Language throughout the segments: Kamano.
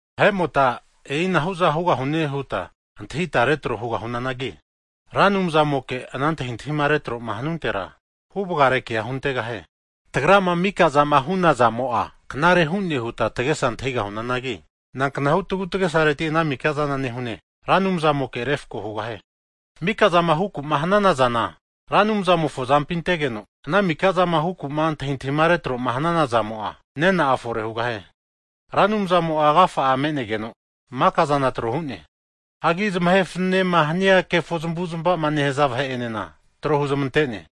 Vahe'mota e'ina hu'za hugahune huta antahintahia retro hugahunanagi, Ra Anumzamoke ana antahintahima retro'ma hanuntera, huvagare kea huntegahie. Tagrama mika zama hu'nazamo'a knare hune huta tagesa antahigahunanagi, nanknahu tagutagesareti ana mika'zana nehune Ra Anumzamoke refako hugahie. Mika'zama huku'ma hanana zana Ra Anumzamofo azampi antegeno, ana mika zama huku'ma antahintahima retro'ma hanana zamo'a, nena'a fore hugahie. Ra Anumzamo'a agafa'a me'negeno maka'zana trohu'ne. Hagi zamahe fananema hania kefo zamavu'zmava'ma nehaza vahe'enena, tro huzmante'ne.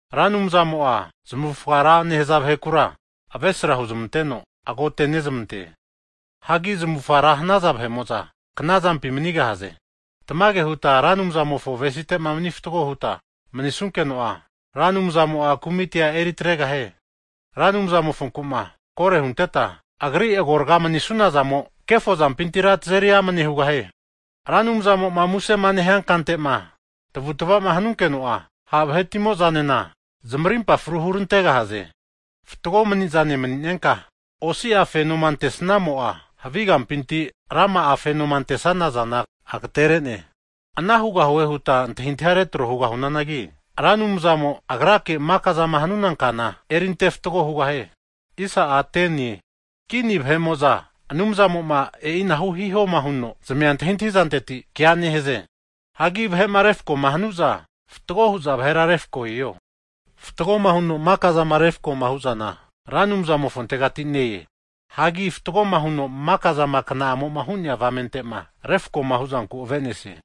Ra Anumzamo'a zamavufga ra nehaza vahekura, avesra huzmanteno agotenezmante. Hagi zamavufara hanaza vahe'mo'za, knazampi manigahaze. Tamage huta Ra Anumzamofo avesinteta mani fatgo huta manisunkeno'a, Ra Anumzamo'a kumitia eritregahie. Ra Anumzamofonku'ma kore hunteta Agri agorga manisunazamo, kefo zampintira tazeri amane hugahie. Ra Anumzamo'ma musema nehia kante'ma tavutva'ma hanunkeno'a, ha' vahetimo'zanena zamarimpa fru hurantegahaze. Fatgo mani'zane mani'nenka osi'a fenoma ante'snamo'a, havi kampinti rama'a fenoma antesana zana agatere'ne. Ana hugahune huta antahintahia retro hugahunanagi, Ra Anumzamo Agrake maka'zama hanuna kana erinte fatgo hugahie. Kini vahe'mo'za Anumzamo'ma e'ina hihoma huno zamia antahi'zanteti kea nehaze. Hagi vahe'ma refakoma hanu'za, fatgo hu'za vahera refako hiho. Fatgoma huno maka'zama refko hu'zana, Ra Anumzamofontegati ne-e. Hagi fatgoma huno maka'zama kna'amo'ma hu'nea avamente'ma refkoma huzanku ave'nesie.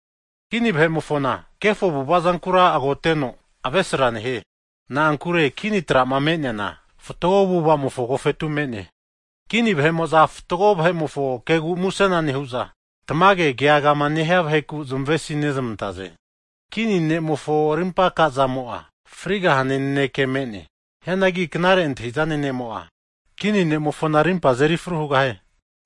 Kini vahe'mofona kefo avu'ava zankura agoteno, avesra nehie. Na'ankure kini tra'ma me'neana, fatgo avu'avamofo agofetu me'ne. Kini vahe'mo'za fatgo vahe'mofo kegu musena nehu'za, tamage keagama nehia vaheku zamavesinezamantaze. Kini ne'mofo rimpa aka'zamo'a frigahane naneke me'ne. Hianagi knare antahi'zane ne'mo'a, kini ne'mofona rimpa azeri fru hugahie.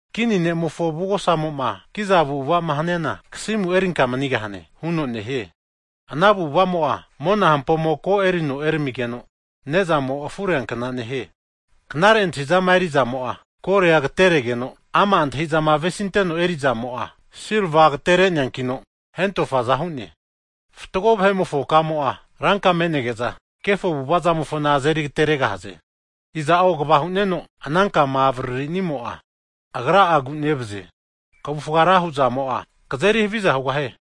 Kini ne'mofo avugosamo'ma kiza avu'ava'ma haniana, kasimu erinka manigahane huno nehie. Ana avu'avamo'a, mona hampomo ko runo eramigeno, ne'zamo afureankna nehie. Knare antahi'zama eri'zamo'a golia agateregeno, ama' antahi'zama avesinteno eri'zamo'a, silva agatere'neankino hentofaza hu'ne. Fatgo vahe'mofo kamo'a, ranka me'nege'za, kefo avu'ava zamofona azeri agateregahaze. Iza'o kva hu'neno ana kama avaririmo'a, agra'a agu'nevazie. Kavufga ra huzamo'a, kazeri haviza hugahie.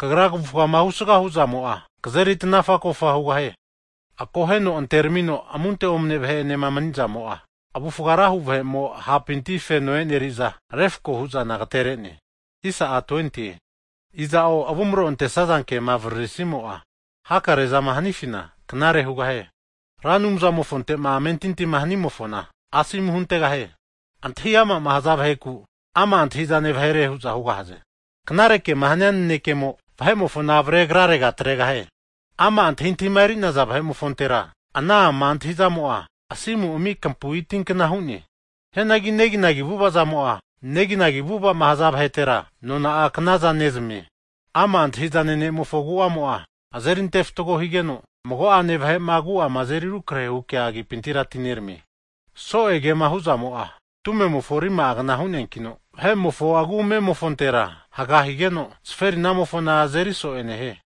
Kagra kavufga husgama hu'zamo'a, kazeri tanafa kofa hugahie. Akoheno anteramino amunte omane vahe'enema mani'zamo'a, avufga ra hu vahemo ha'pinti feno eri'neaza refko hu'zana agatere'ne. Iza'o avumro antesaza kema avaririsimo'a, hakare'zama hanifina knare hugahie. Ra Anumzamofonte'ma amentintima hanimofona, asomu huntegahie. Antahi ama'ma haza vaheku, ama' antahi'zane vahere hu'za hugahaze. Knare kema hania nanekemo, vahe'mofona avare agrarega atregahie. Ama' antahintahima eri'naza vahe'mofontera ana ama' antahi'zamo'a asimu ami kampu'i tinkna hu'ne. Hianagi neginagi avu'ava zamo'a, neginagi avu'ava'ma nehaza vahetera, nona'a knaza nezamie. Ama' antahi'zane ne'mofo agu'amo azeri ante fatgo higeno, mago'ane vahe'ma agu'ama azeri rukrahe hu kea agipintira atineramie. So'e kema hu'zamo'a tumemofo rima'agna hu'neankino, vahe'mofo agu'amemofontera haga higeno, zaferinamofona azeri so'e nehie.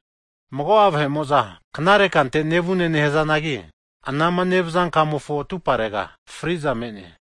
Mago'a vahe'mo'za knare kante nevune nahazanagi, anama nevaza kamofo atuparega fri'za me'ne.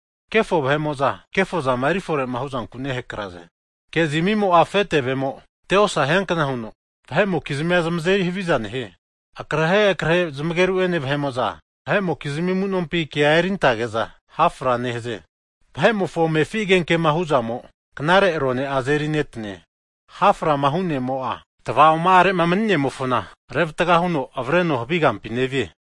Kefo vahe'mo'za kefozama eri fore huzanku nehakraze. Ke'zmimo'a afe tevemo te'osa hiankna huno, vahe'mokizmia zamazeri haviza nehie. Akrehe akrehe zamageru'ene vahe'mo'za, vahe'mokizmi amu'nompina kea erintage'za ha' fra nehaze. Vahe'mofo amefi agenke'ma huzamo knare arone'a, azeri netane. Haframahu ne'mo'a, tava'oma'are'ma nemanimofona revatga huno avreno havi kante nevie.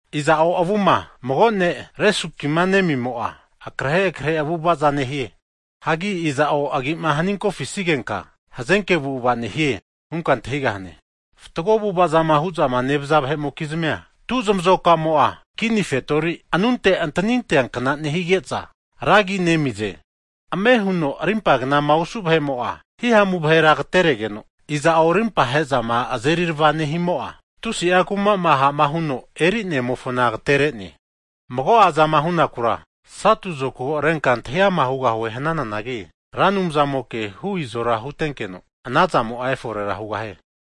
Iza'o avuma mago ne' resuki nemimo'a, akrehe akrehe avu'avaza nehie. Hagi iza'o agi'ma haninkofisigenka, hazenke avu'ava nehie hunka antahigahane. Fatgo avu'ava zama hu'zama nevaza vahe'mokizmia tu zamazokamo'a, kini fetori anunte antanintea kna nehige'za, ra agi nezamize. Ame huno arimpa'gnama osu vahe'mo'a himamu vahera agateregeno, iza'o rimpa he'zama azerirava nehimo'a, tusi'a kuma'ma ha'ma huno eri'nemofona agatenere. Mago'azama hunakura satu zokago renka antahiama hugahue hnananagi Ra Anumzamoke hu izora hutenkeno, anazamo'a eforera hugahie.